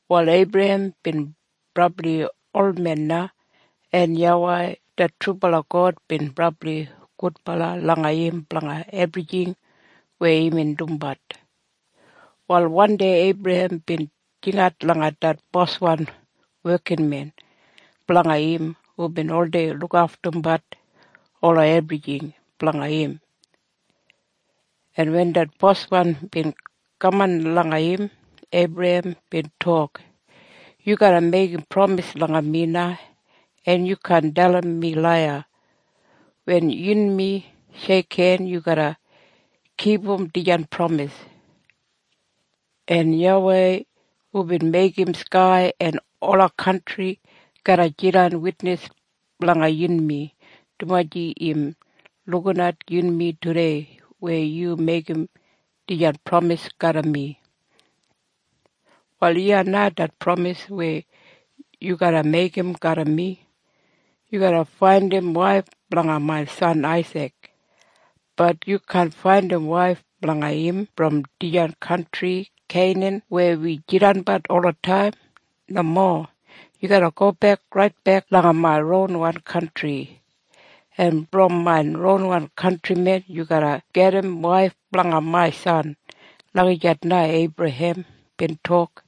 Wal Eibrahem bin brabli olmen na, en YAWEI det trubala God bin brabli gudbala langa im blanga ebrijing weya imbin dumbat. Wal wandei Eibrahem bin jingat langa det boswan wekinmen blanga im hubin oldei lukaftumbat ola ebrijing blanga im. En wen det boswan bin kaman langa im, Eibrahem bin tok, “Yu garra meigim pramis langa mi en yu kaan dalim mi laiya. Wen yunmi sheikhen, yu garra kipum dijan pramis. En YAWEI hubin meigim skai en ola kantri garra jidan witnis blanga yunmi, dumaji im lukinat yunmi tudei weya yu meigim dijan pramis garram mi. “Wal iya na det pramis weya yu garra meigim garram mi. Yu garra faindim waif blanga main san Aisik. Bat yu kaan faindim waif blanga im brom dijan kantri Keinan weya wi jidanbat olataim. Nomo. Yu garra gobek raitbek langa main ronwan kantri, en brom main ronwan kantrimen yu garra gajim waif blanga main san.” Lagijat na Eibrahem bin tok.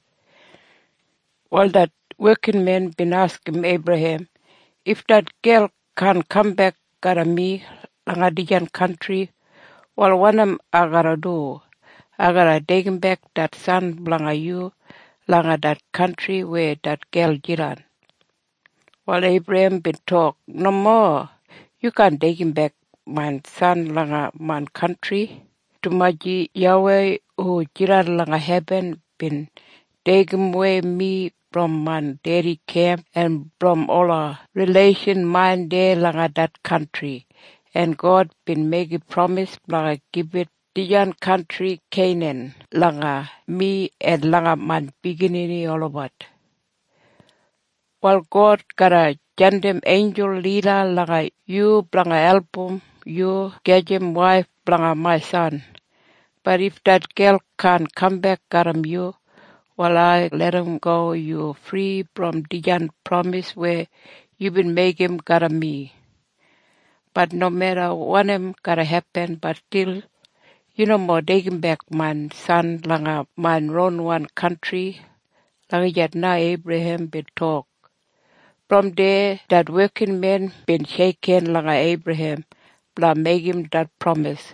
Wal det wekinmen bin askim Eibrahem, “If det gel kaan kambek garram mi langa dijan kantri, wal wanim ai garra du? Ai garra deigimbek det san blanga yu langa det kantri weya det gel jidan?” Wal Eibrahem bin tok, “Nomo. Yu kaan deigimbek main san langa main kantri, dumaji YAWEI hu jidan langa hebin bin deigimwei mi brom main dedi kemp en brom ola rileishan main deya langa det kantri, en God bin meigim pramis blanga gibit dijan kantri Keinan langa mi en langa main biginini olabat. “Wal God garra jandim einjul lida langa yu blanga album yu gajim waif blanga main san. Bat if det gel kaan kambek garram yu, wal ai larramgo yu fri brom dijan pramis weya yubin meigim garram mi. Bat nomeda wanim garra hepin, bat stil yu nomo deigimbek main san langa main ronwan kantri.” Lagijat na Eibrahem bin tok. Brom deya det wekinmen bin sheikhen langa Eibrahem blanga meigim det pramis.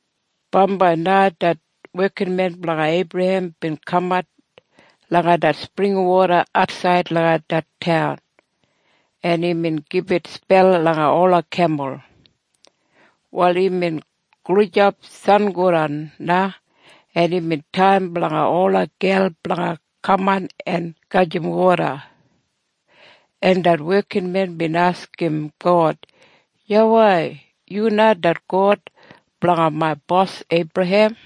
Bambai na det wekinmen blanga Eibrahem bin kamat langa det springwoda atsaid langa det taun, en imbin gibit spel langa ola kemul. Wal imbin gulijap sangodan na, en imbin taim blanga ola gel blanga kaman en gajim woda, en det wekinmen bin askim God, “YAWEI, yu na det God blanga main bos Eibrahem.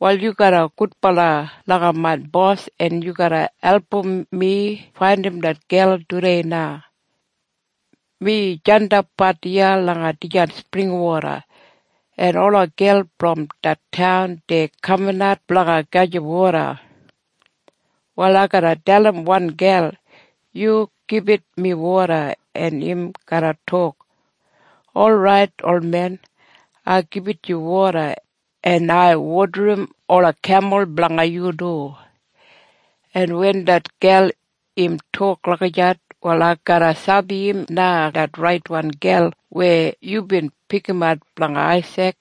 Wal yu garra gudbala langa main bos en yu garra album mi faindim det gel tudei na. Mi jandapbat iya langa dijan springwoda, en ola gel brom det taun dei kaminat blanga gajim woda. “Wal ai garra dalim wan gel, ‘Yu gibit mi woda.’ En im garra tok, ‘Orait, olmen. Ai gibit yu woda. En ai wodarim ola kemul blanga yu du.’ En wen det gel im tok lagijat, wal ai garra sabi im na det raitwan gel weya yubin pikimat blanga Aisik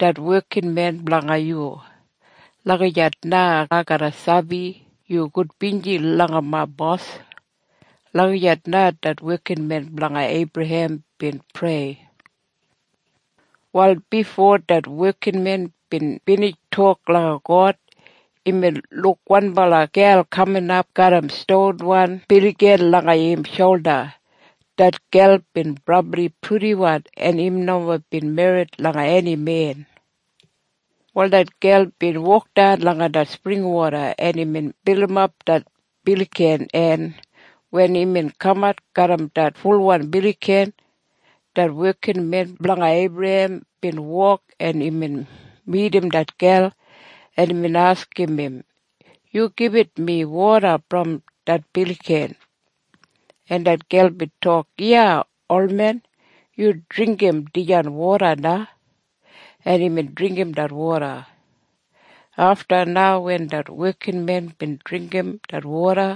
det wekinmen blanga yu. Lagijat na ai garra sabi yu gudbinji langa main bos.” Lagijat na det wekinmen blanga Eibrahem bin prei. Wal bifo det wekinmen bin binij tok langa God, imbin luk wanbala gel kaminap garram stonwan biligan langa im sholda. Det gel bin brabli purdiwan, en im nomo bin merrit langa eni men. Wal det gel bin wokdan langa det springwoda, en imbin bilimap det biligan en wen imbin kamat garram det fulwan biligan, det wekinmen blanga Eibrahem bin wok, en imbin midim det gel, en imbin askim im, “Yu gibit mi woda brom det biligan.” En det gel bin tok, “Iya, olmen. Yu dringgim dijan woda na.” En imbin dringgim det woda. Afta na wen det wekinmen bin dringgim det woda,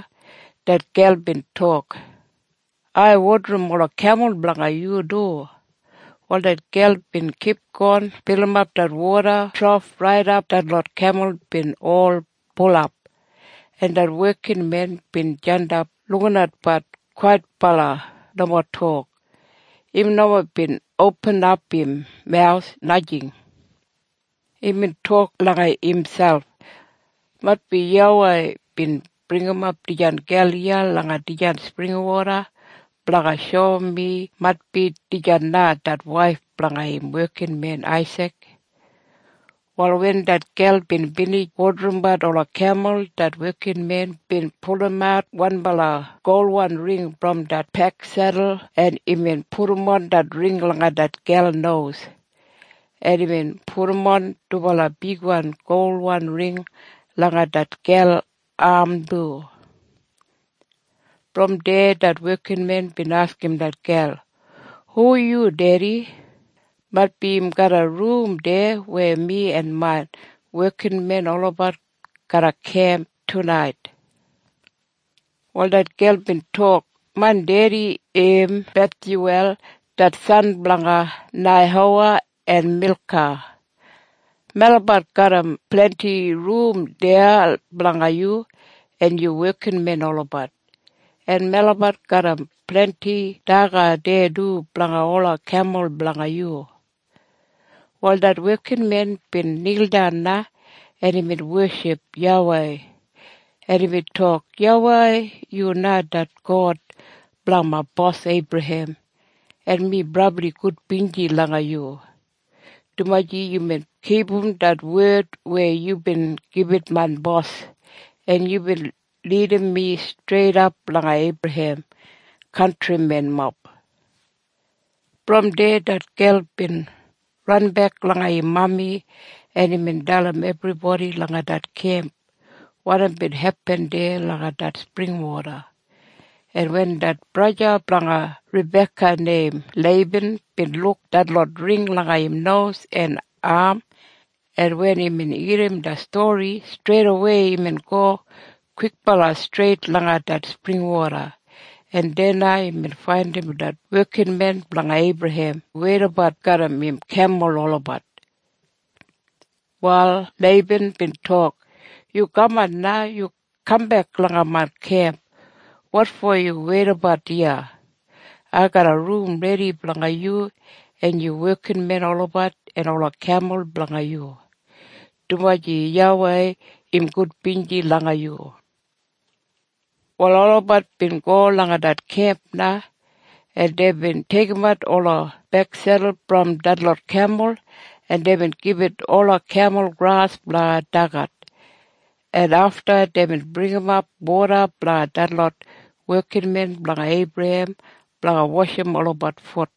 det gel bin tok, “Ai wodarim ola kemul blanga yu du.” Wal det gel bin kipgon bilimap det woda trof raidap detlot kemul bin ol bulap, en det wekinmen bin jandap lukinatbat kwaitbala nomo tok. Im nomo bin opinim im mawus, najing. Imbin tok langa imselp, “Maitbi YAWEI bin bringimap dijan gel iya langa dijan springwoda blanga shoum mi maitbi dijan na det waif blanga im wekinmen Aisik.” Wal wen det gel bin binij wodarimbat ola kemul, det wekinmen bin pulumat wanbala golwan ring brom det peksedul en imbin pudumon det ring langa det gel nos, en imbin pudumon dubala bigwan golwan ring langa det gel am du. Brom deya det wekinmen bin askim det gel, “Hu yu dedi? Maitbi im garram rum deya weya mi en main wekinmen olabat garra kemp tunait?” Wal det gel bin tok, “Main dedi im Bethyuwel det san blanga Neihowa en Milka. Melabat garram blendi rum deya blanga yu en yu wekinmen olabat. En melabat garram blendi daga deya du blanga ola kemul blanga yu.” Wal det wekinmen bin nildan na, en imbin weship YAWEI, en imbin tok, “YAWEI yu na det God blanga main bos Eibrahem, en mi brabli gudbinji langa yu, dumaji yubin kipum det wed weya yubin gibit main bos, en yubin lidim mi streidap langa Eibrahem kantrimenmob.” Brom deya det gel bin ranbek langa im mami, en imbin dalim ebribodi langa det kemp wanim bin hepin deya langa det springwoda. En wen det braja blanga Rabeka neim Leiban bin luk detlot ring langa im nos en am, en wen imbin irrim det stori, streidawei imbin go kwikbala streit langa det springwoda, en deya na imbin faindim det wekinmen blanga Eibrahem weidabat garram im kemul olabat. Wal Leiban bin tok, “Yu kaman na. Yu kambek langa main kemp. Wotfo yu weidabat iya? Ai garram rum redi blanga yu en yu wekinmen olabat en ola kemul blanga yu, dumaji YAWEI im gudbinji langa yu.” Wal olabat bin go langa det kemp na, en deibin deigimat ola peksedul brom detlot kemul. En deibin gibit ola kemul gras blanga daga. En afta deibin bringimap woda blanga detlot wekinmen blanga Eibrahem blanga washim olabat fut.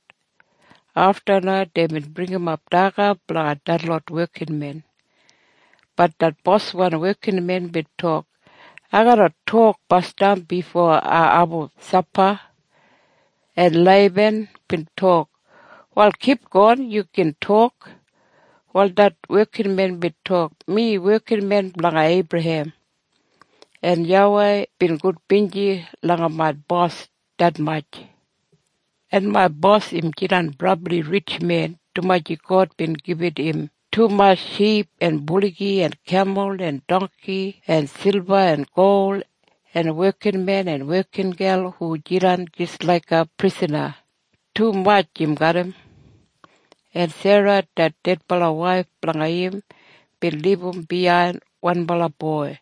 Afta na deibin bringimap daga blanga detlot wekinmen. Bat det boswan wekinmen bin tok, “Ai garra tok basdam bifo ai abum sapa.” En Leiban bin tok, “Wal kipgon. Yu gin tok.” Wal det wekinmen bin tok, “Mi wekinmen blanga Eibrahem. En YAWEI bin gudbinji langa main bos detmatj. En main bos im jidan brabli ritj men, dumaji God bin gibit im tumatj ship en buligi en kemul en dongki en silba en gol en wekinmen en wekingel hu jidan jis laiga prisana. Tumatj im garram. “En Sera det dedbala waif blanga im bin libum biyain wanbala boi.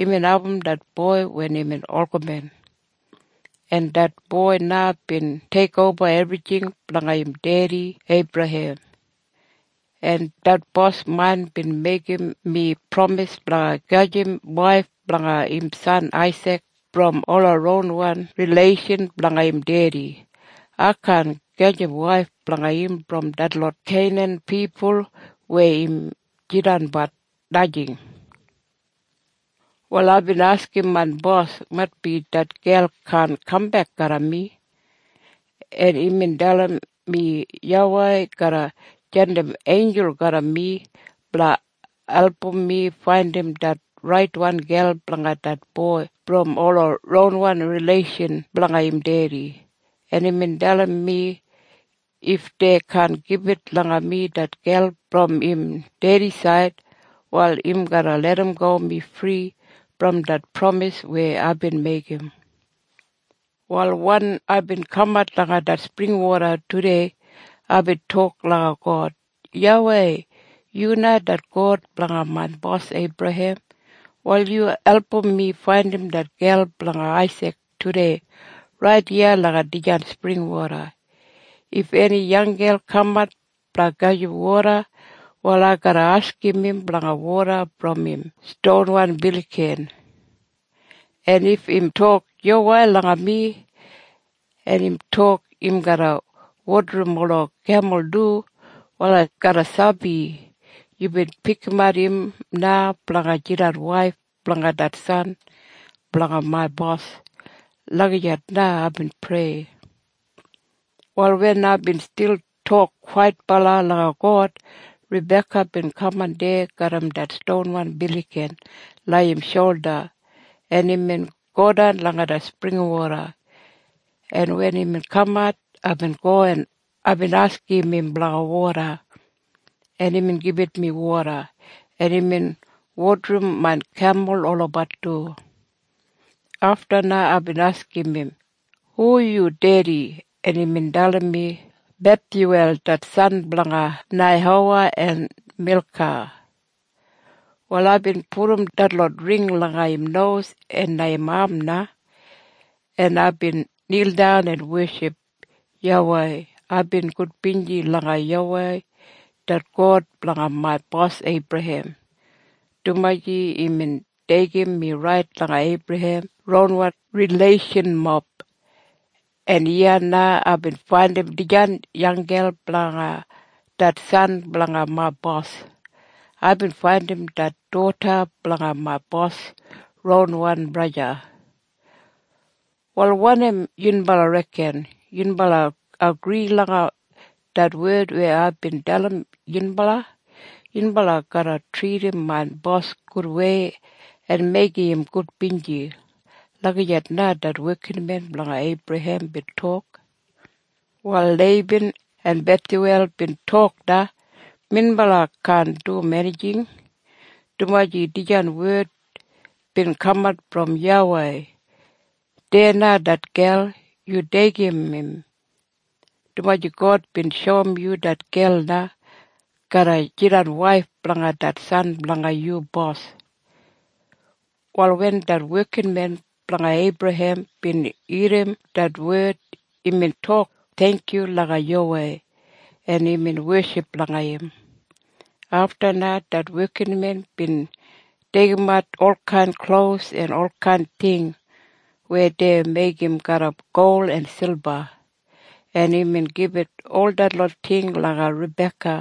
Imbin abum det boi wen imbin olgamen. En det boi na bin teikoba ebrijing blanga im dedi Eibrahem. En det bos main bin meigim mi pramis blanga gajim waif blanga im san Aisik brom ola ronwan rileishan blanga im dedi. Ai kaan gajim waif blanga im brom detlot Keinan pipul weya im jidanbat. Najing. “Wal aibin askim main bos, ‘Maitbi det gel kaan kambek garram mi.’ En imbin dalim mi YAWEI garra jandim einjul garram mi blanga album mi faindim det raitwan gel blanga det boi brom ola ronwan rileishan blanga im dedi. En imbin dalim mi, if dei kaan gibit langa mi det gel brom im dedisaid, wal im garra larramgo mi fri brom det pramis weya aibin meigim. “Wal wen aibin kamat langa det springwoda tudei, aibin tok langa God, ‘YAWEI, yu na det God blanga main bos Eibrahem. Wal yu album mi faindim det gel blanga Aisik tudei rait iya langa dijan springwoda. If eni yanggel kamat blanga gajim woda, wal ai garra askim im blanga woda brom im stonwan biligan, en if im tok yuwai langa mi, en im tok im garra wodarim ola kemul du, wal ai garra sabi yubin pikimat im na blanga jidan waif blanga det san blanga main bos.’ Lagijat na aibin prei. “Wal wen aibin stil tok kwaitbala langa God, Rabeka bin kaman deya garram det stonwan biligan langa im sholda, en imbin godan langa det springwoda, en wen imbin kamat, aibin go, en aibin askim im blanga woda. En imbin gibit mi woda. En imbin wodarim main kemul olabat du. “Afta na aibin askim im, ‘Hu yu dedi?’ En imbin dalim mi, ‘Bethyuwel det san blanga Neihowa en Milka.’ “Wal aibin pudum detlot ring langa im nos en am na, en aibin nildan en weship YAWEI. Aibin gudbinji langa YAWEI det God blanga main bos Eibrahem, dumaji imbin deigim mi rait langa Eibrahem ronwan rileishanmob, en iya na aibin faindim dijan yanggel blanga det san blanga main bos. Aibin faindim det doda blanga main bos ronwan braja. “Wal wanim yunbala reken? Yunbala agri langa det wed weya aibin dalim yunbala? Yunbala garra tridim main bos gudwei en meigim im gudbinji?” Lagijat na det wekinmen blanga Eibrahem bin tok. Wal Leiban en Bethyuwel bin tok na, “Minbala kaan dum enijing, dumaji dijan wed bin kaman brom YAWEI. Deya na det gel. Yu deigim im, dumaji God bin shoum yu det gel na garra jidan waif blanga det san blanga yu bos.” Wal wen det wekinmen blanga Eibrahem bin irrim det wed, imbin tok theingkyu langa YAWEI, en imbin weship langa im. Afta na det wekinmen bin deigimat olkain klos en olkain ting weya dei meigim garram gol en silba, en imbin gibit ol detlot ting langa Rabeka,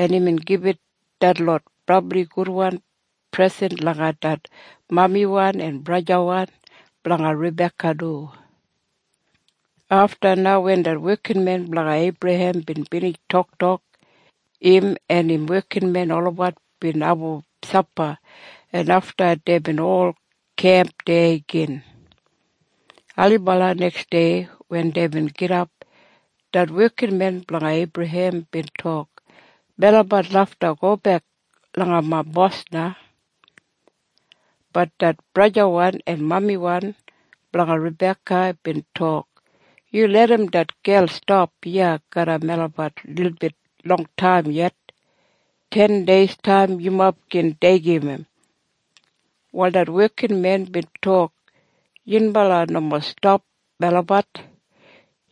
en imbin gibit detlot brabli gudwan presen langa det mamiwan en brajawan blanga Rabeka du. Afta na wen det wekinmen blanga Eibrahem bin binij toktok, im en im wekinmen olabat bin abum sapa, en afta deibin ol kemp deya gin. Ailibala neksdei wen deibin gidap, det wekinmen blanga Eibrahem bin tok, “Melabat lafta gobek langa main bos na.” Bat det brajawan en mamiwan blanga Rabeka bin tok, “Yu larram det gel stap iya garram melabat lilbit longtaim yet. Tendeistaim yumob gin deigim im.” Wal det wekinmen bin tok, “Yunbala nomo stapam melabat.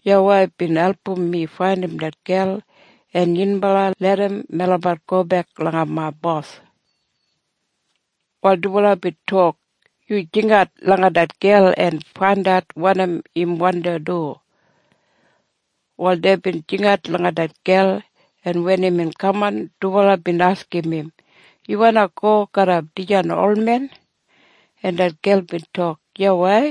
YAWEI bin album mi faindim det gel. En yunbala larram melabat gobek langa main bos.” Wal dubala bin tok, “Yu jingat langa det gel en faindat wanim im wandi du.” Wal deibin jingat langa det gel, en wen imbin kaman, dubala bin askim im, “Yu wandi go garram dijan olmen?” En det gel bin tok, “Yuwai.”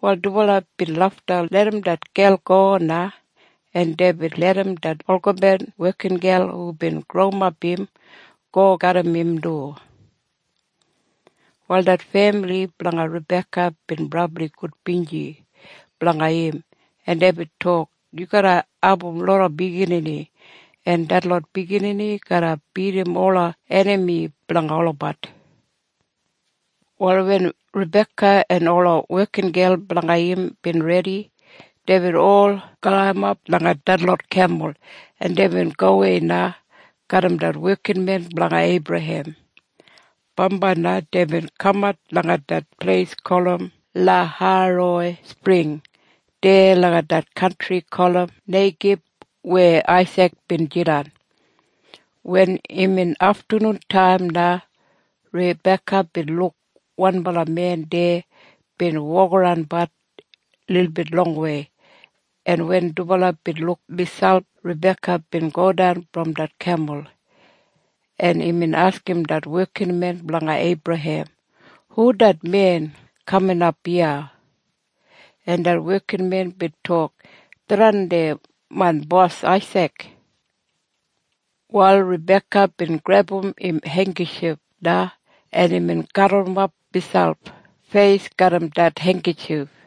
Wal dubala bin lafta larram det gel go na, en deibin larram det olgamen wekingel hubin growimap im go garram im du. Wal det femili blanga Rabeka bin brabli gudbinji blanga im, en deibin tok, “Yu garra abum loda biginini, en detlot biginini garra bidim ola enami blanga olabat.” Wal wen Rabeka en ola wekingel blanga im bin redi, deibin ol galimap langa detlot kemul, en deibin gowei na garram det wekinmen blanga Eibrahem. Bambai na deibin kamat langa det pleis gulum Lahairoi Spring deya langa det kantri gulum Neigib weya Aisik bin jidan. Wen imbin aftanuntaim na Rabeka bin luk wanbala men deya bin wokaranbat lilbit longwei. En wen dubala bin luk miselp, Rabeka bin godan brom det kemul, en imbin askim det wekinmen blanga Eibrahem, “Hu det men kaminap iya?” En det wekinmen bin tok, “Tharran main bos Aisik.” Wal Rabeka bin grebum im heinggitjif na, en imbin gaburrumap miselp feis garram det heinggitjif.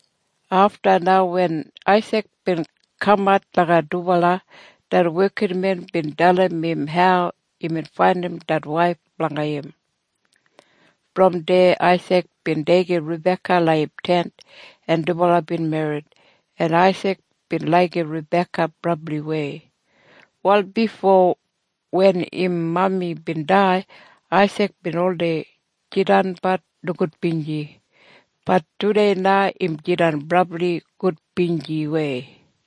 Afta na wen Aisik bin kamat langa dubala, det wekinmen bin dalim im hau imbin faindim det waif blanga im. Brom deya Aisik bin deigim Rabeka langa im tent, en dubala bin merrit, en Aisik bin laigim Rabeka brabliwei. Wal bifo wen im mami bin dai, Aisik bin oldei jidanbat nogudbinji. Bat tudei na im jidan brabli gudbinjiwei.